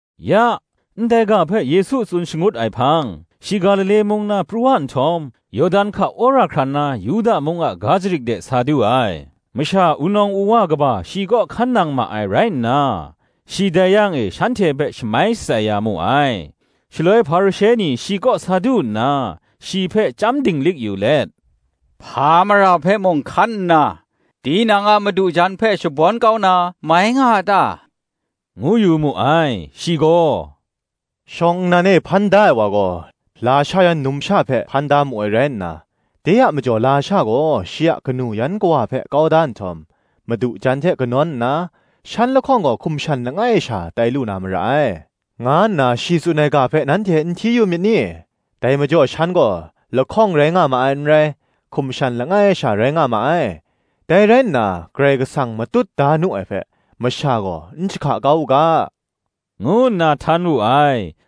Ya, ndai ga hpe Yesu tsun shangut ai hpang, shi Galile mung na pru wa nhtawm, Yawdan hka wora hkran na Yuda mung a ga jarit de sa du ai. Masha wunawng wuwa kaba shi kaw hkan nang ma ai rai nna, shi dai yang e shanhte hpe shamai shatsai ya mu ai. Shaloi Hparishe ni shi kaw sa du nna, shi hpe chyam dinglik yu let, “Hpa mara hpe mung hkan nna, tinang a madu jan hpe shabawn kau na, mai nga a ta?” ngu yu mu ai. Shi gaw, “Shawng nnan e hpan da ai wa gaw, lasha yan numsha hpe hpan da mu ai rai nna, De a majaw lasha gaw shi a kanu yan kawa hpe kau da nhtawm, madu jan hte kanawn nna, shan lahkawng gaw hkum shan langai sha tai lu na mara ai, nga nna shi tsun ai ga hpe nanhte n hti yu myit ni? Dai majaw shan gaw, lahkawng rai nga ma ai n rai, hkum shan langai sha rai nga ma ai. Dai rai nna, Karai Kasang matut da nu ai hpe, masha gaw n jahka kau u ga,” ngu nna htan wu ai.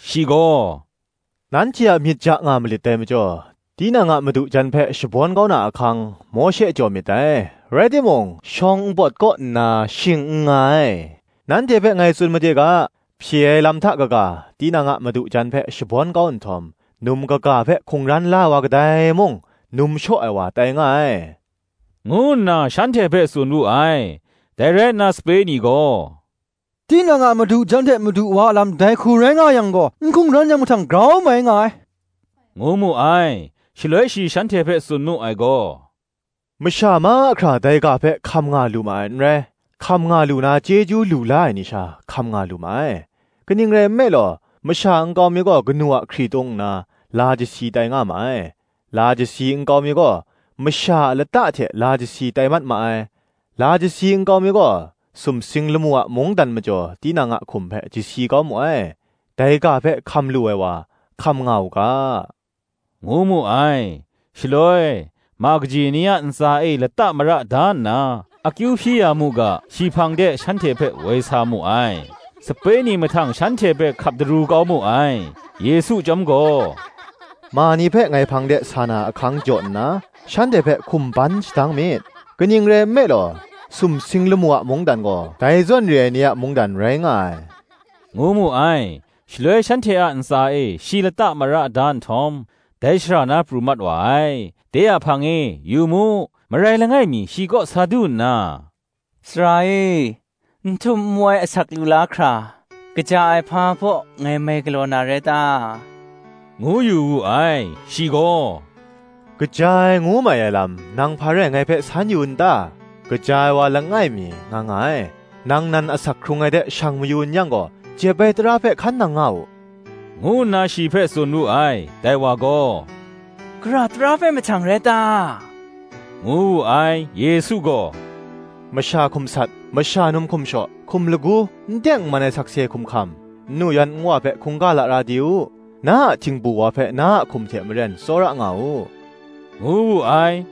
Shi gaw, “nanhte a myit ja nga malit dai majaw, tinang a madu jan hpe shabawn kau na ahkang, Mawshe jaw myit dai; rai timung, shawng npawt kaw nna shing n nga ai. Nanhte hpe ngai tsun made ga, Hpye ai lam hta kaga, tinang a madu jan hpe shabawn kau nhtawm, num kaga hpe hkungran la ai wa kadai mung, num shaw ai wa tai nga ai,” ngu nna shanhte hpe tsun wu ai. Dai rai nna sape ni gaw, “tinang a madu jan hte madu wa a lam dai hku rai nga yang gaw n hkungran yang mahtang grau mai nga ai,” ngu mu ai. Shaloi shi shanhte hpe tsun mu ai gaw, “Masha mahkra dai ga hpe hkam nga lu ma ai. n rai; hkam nga lu na chyeju lu la ai ni sha, hkam nga lu ma ai. Kaning rai nme law, masha nkau mi gaw kanu a hkritung nna la chyasi tai nga ma ai; la chyasi nkau mi gaw, masha a lata hte la chyasi tai mat ma ai; la chyasi nkau mi gaw, sumsing lamu a mungdan majaw tinang a hkum hpe chyasi kau mu ai: dai ga hpe hkam lu ai wa, hkam nga u ga,” ngu mu ai. Shaloi, ma kaji ni a ntsa e lata mara da nna, akyu hpyi ya mu ga, shi hpang de shanhte hpe woi sa mu ai: sape ni mahtang shanhte hpe hkap daru kau mu ai. Yesu chyawm gaw, “Ma ni hpe ngai hpang de sa na ahkang jaw nna shanhte hpe hkum ban shadang myit; kaning rai nme law, sumsing lamu a mungdan gaw dai zawn re ai ni a mungdan rai nga ai,” ngu mu ai. Shaloi shanhte a ntsa e shi lata mara da nhtawm, dai shara na pru mat wa ai. De a hpang e, yu mu, marai langai mi shi kaw sa du nna, “Sara e, n htum nwai asak lu la hkra, kaja ai hpa baw ngai mai galaw na rai ta?” ngu yu wu ai. Shi gaw, “Kaja ai ngu mai ai lam, nang hpa rai ngai hpe san yu n ta? Kaja ai wa langai mi nga nga ai: nang nan asak hkrung ai de shang mayu n yang gaw, jep ai tara hpe hkan nang nga u,” ngu nna shi hpe tsun wu ai. Dai wa gaw, “Gara tara hpe mahtang rai ta?” ngu wu ai. Yesu gaw, “Masha hkum sat, masha num hkum shaw, hkum lagu, n teng n man ai sakse hkum hkam; nnu yan nwa hpe hkungga lara di u; na a htingbu wa hpe na a hkum hte maren tsawra nga u,” ngu wu ai.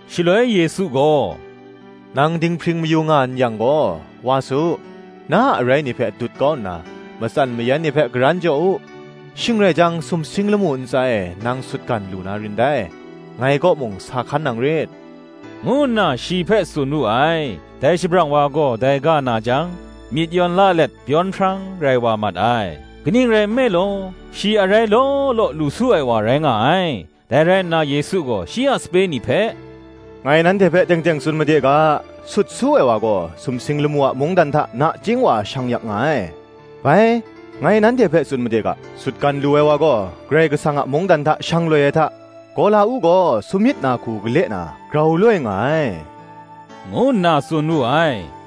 Shaloi Yesu gaw, “Nang dinghpring mayu nga n yang gaw, wa su, na a arai ni hpe dut kau nna, matsan mayan ni hpe karan jaw u; shing rai jang, sumsing lamu ntsa e nang sutgan lu na rin dai: ngai kaw mung sa hkan nang rit,” ngu nna shi hpe tsun wu ai. Dai shabrang wa gaw dai ga na jang, myit yawn la let byawn hprang rai mat wa ai: kaning rai nme law, shi arai law law lu su ai wa rai nga ai. Dai rai nna Yesu gaw shi a sape ni hpe, “Ngai nanhte hpe teng teng tsun made ga, sut su ai wa gaw, sumsing lamu a mungdan hta nachying wa shang yak nga ai. Bai, ngai nanhte hpe tsun made ga, Sutgan lu ai wa gaw Karai Kasang a mungdan hta shang loi ai hta, gawla-uk gaw samyit na hku gale na grau loi nga ai,” ngu nna tsun wu ai.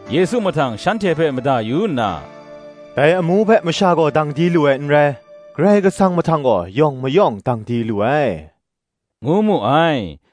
Yesu mahtang shanhte hpe mada yu nna, “Dai amu hpe masha gaw dang di lu ai n rai; Karai Kasang mahtang gaw, yawng mayawng dang di lu ai,” ngu mu ai.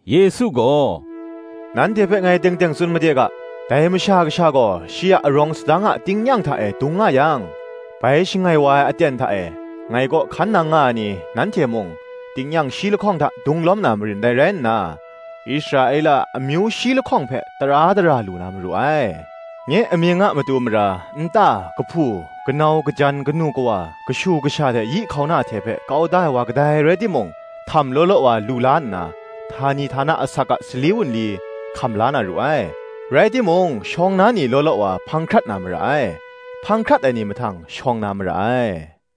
Yesu gaw, “Nanhte hpe ngai teng teng tsun made ga, dai Masha Kasha gaw shi a arawng sadang a tingnyang hta e dung nga yang, bai shangai wa ai aten hta e ngai kaw hkan nang nga ai ni, nanhte mung, tingnyang shi lahkawng hta dung lawm na marin dai rai nna, Israela a amyu shi lahkawng hpe tara dara lu na maru ai. Nye amying a matu mara, nta, kahpu kanau, kajan, kanu kawa, kashu kasha hte yi hkauna hte hpe kau da ai wa kadai rai timung, htam law law wa lu la nna, htani htana asak a sali wunli hkam la na ru ai. Rai timung shawng na ni law law wa hpang hkrat na mara ai; hpang hkrat ai ni mahtang shawng na mara ai.